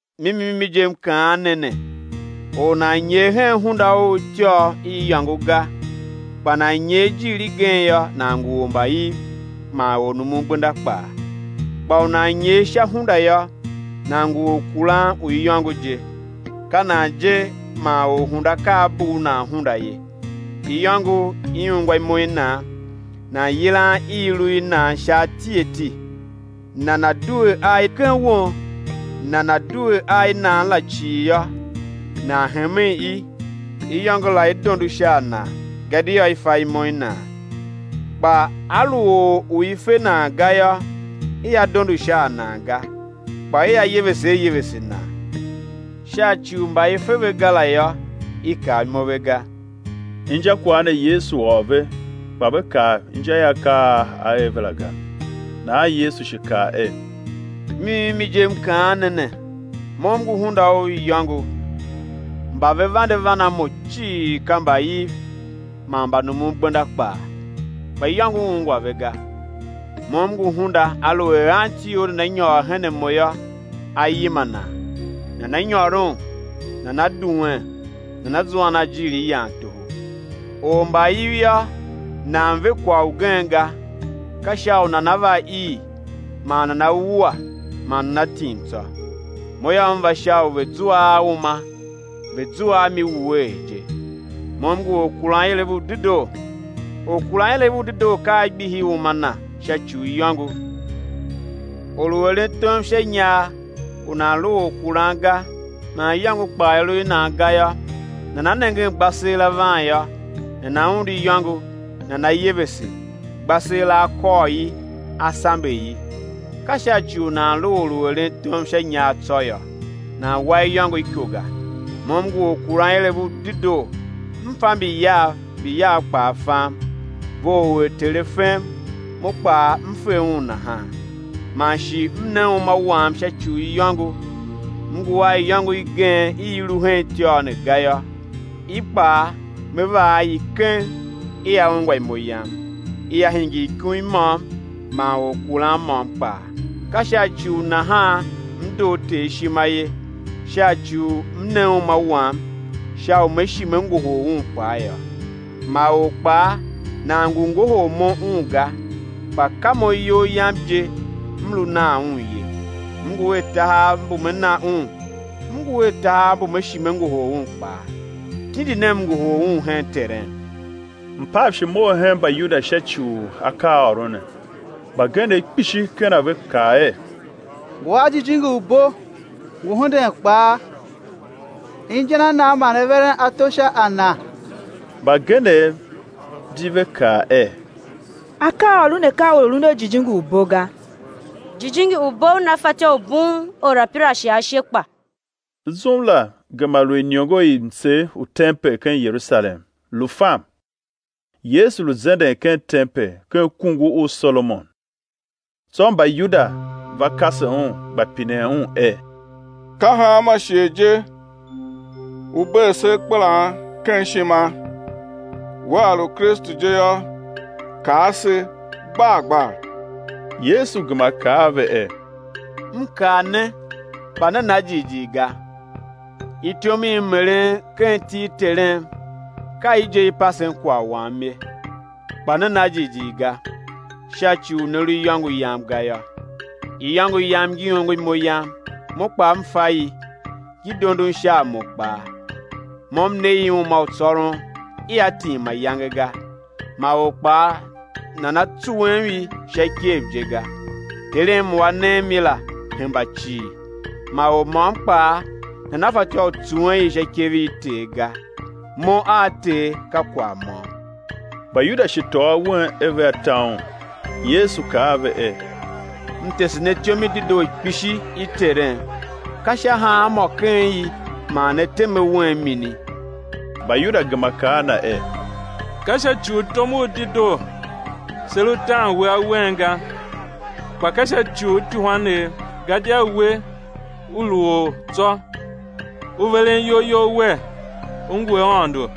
Mimi mimi je, M kaan ne ne, or u nan nyer hen hunda u ityôr i iyôngo ga, kpa nan nyer i jiir igen yô, nan ngu ormbaiv man ornumungbenda kpaa. Kpa u nan nyer sha hunda yô, nan ngu orkuran u iyôngo je. Ka nan je man orhunda ka a bugh nan hunda ye; iyôngo i ungwa imo i nan; nan yilan i i lu i nan sha ati ati, nan due a i ken won. Nana due a i nan la cii yô, nan hemen i, iyôngo la i dondo sha a nan gadia i fa imo i nan. Kpa a lu or u i fe nan ga yô, ia dondo sha a nan ga, kpa ia yevese a yevese nan, sha ci u mba i fe ve ga la yô i kav imo ve ga. Injakwagh ne, Yesu ôr ve, kpa ve kav inja i akaa a A er ve la ga. Nahan Yesu shi kaa er: Mimi mimi je, M kaan ne ne, Mo M ngu hunda u iyôngo. Mba ve vande van a Mo cii, ka mbaiv man mbanumungbenda kpaa; kpa iyôngo ungwa ve ga. Mo M ngu hunda; aluer anti or nana nyôr her a Mo yô, á yima nan; nana nyôron, nana duen nana zuan a ijiir i yan toho. Ormbaiv yô, nan ve kwagh ugen ga, ka sha u nana va ii man nana wua man nana tim tsô; Mo yô, M va sha u ve̱ zua a uma, ve̱ zua a mi wuee je. Mo M ngu Orkuranilev u dedoo; orkuranilev u dedoo ka A gbihi uma na sha ci u iyôngo. Or u eren tom sha inyar u nan lu orkuran ga, man iyôngo kpaa i lu i nan ga yô, nana nengen gbaseela van yô, nana undu iyôngo, nana yevese, gbaseela a kôr i, a sambe i; ka sha ci u nan lu or u eren tom sha inyar tsô yô, nan wa iyôngo iko ga. Mo M ngu Orkuranilev u dedoo; M fa mbi Yav, mbi Yav kpaa fam, vough er Ter A fem, Mo kpaa M fe Un nahan; man shi M ne uma Wam sha ci u iyôngo. M ngu a iyôngo igen i i lu hen ityôr ne ga yô, i kpaa Me va a i keng, ia ungwa imo Yam; ia hingir ikum i môm man orkuran môm kpaa. Ka sha ci u nahan M doo Ter ishima ye, sha ci u M ne uma Wam, sha u Me shi Me ngohol un kpaa yô. Ma or kpaa nan ngu ngohol Mo un ga, kpa ka Mo iyol Yam je M lu nan un ye. M ngu a tahav mbu Me na un, M ngu a tahav mbu Me shi Me ngohol un kpaa. Tindi ne M ngohol un hen Terem. Mpav shi mough hen Mbayuda sha ci u akaaôron ne. Mbagenev kpishi ken a ve kaa er: Ngu a jijingi u bo, ngu hunden kpaa; inja na nan man ne veren ato sha a Na? Mbagenev di ve kaa er: Akaaôron ne ka a or u lun a jijingi u bo ga; jijingi u bo una fatyô u bughun orapirashe ashe kpa? Zum la gema lu iniongo i mtsegh u tempel ken Yerusalem, lu fam. Yesu lu zenden ken tempel ken kungur u Solomon. Tsô Mbayuda va kase Un, gba pinen Un er: Ka hanma shighe je U bee se akpelan ken ishima? Wea lu Kristu je yô, kaa se gbar gbar. Yesu gema kaa a ve er: M kaa ne, kpa ne na jighjigh ga, ityom i M eren ken iti i Terem, ka i je i pasen kwagh Wam ye. Kpa ne na jighjigh ga, sha ci u ne lu ken iyôngo Yam ga yô. Iyôngo Yam ngi ongo imo Yam, Mo kpaa M fa i, ngi dondon sha a Mo kpaa. Mo m ne i uma u tsôron ia tim mayange ga, ma or kpaa nana tsuwem i sha ikev je ga. Terem u A nem i la, hemba cii; ma or môm kpaa nana fatyô u tsuwen i sha ikev i Ter ga. Mo a Ter ka kwagh môm. Mbayuda shi tôô awen er vea ta Un. Yesu kaa a ve er: M tese ne ityom i dedoo kpishi i Terem; ka sha hanmô ken i man ne tem awen mini? Mbayuda gema kaa a Na er: Ka sha ci u tom u dedoo se lu tan We awen ga, kpa ka sha ci u ityuhwanev, gadia We, U lu or tsô, U veren iyol You Wer, U ngu Aôndo.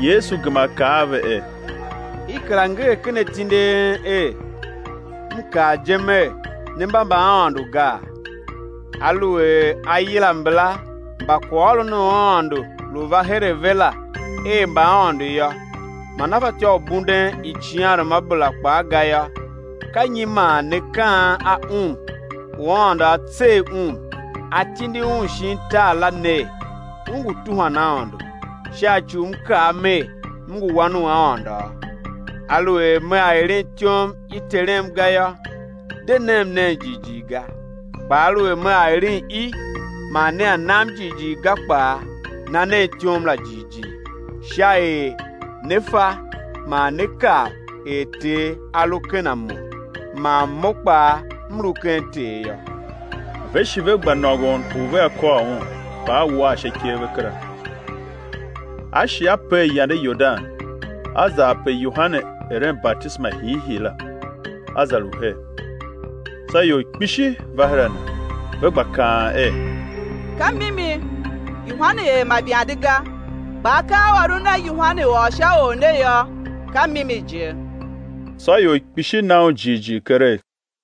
Yesu gema kaa a ve er: I kera nger ken atindi a en er: M kaa je Mer, ne mba mbaaôndo gaa? Aluer a yila mbala mba kwaghôron u Aôndo lu va her a ve la er mbaaôndo yô, man a fatyô u bunden icighanruamabera kpaa ga yô, ka nyi man ne kaan a Un u Aôndo a tsegh Un, A tindi Un shin tar la, ner: U ngu tuhwan Aôndo, sha ci u M kaa Mer: M ngu Wan u Aôndo? Aluer Mea eren ityom i Terem ga yô, de nem nen jighjigh ga; kpa aluer Mea eren i, man nea nam jighjigh ga kpaa, na nen ityom la jighjigh; sha er ne̱ fa man ne̱ kav er Ter A lu ken a Mo, man Mo kpaa M lu ken Ter yô. Ve shi ve gba nôngon u vea kôr Un, kpa A war sha ikev ve kera. A shi A per yande Yordan, A za ape Yohane eren batisema hiihii la, A za lu her. Tsô ior kpishi va her a Na, ve gba kaan er: Ka mimi, Yohane er ma ivande ga, kpa akaaôron a Yohane ôr sha Or ne yô, ka mimi je. Tsô ior kpishi na Un jighjigh keregh.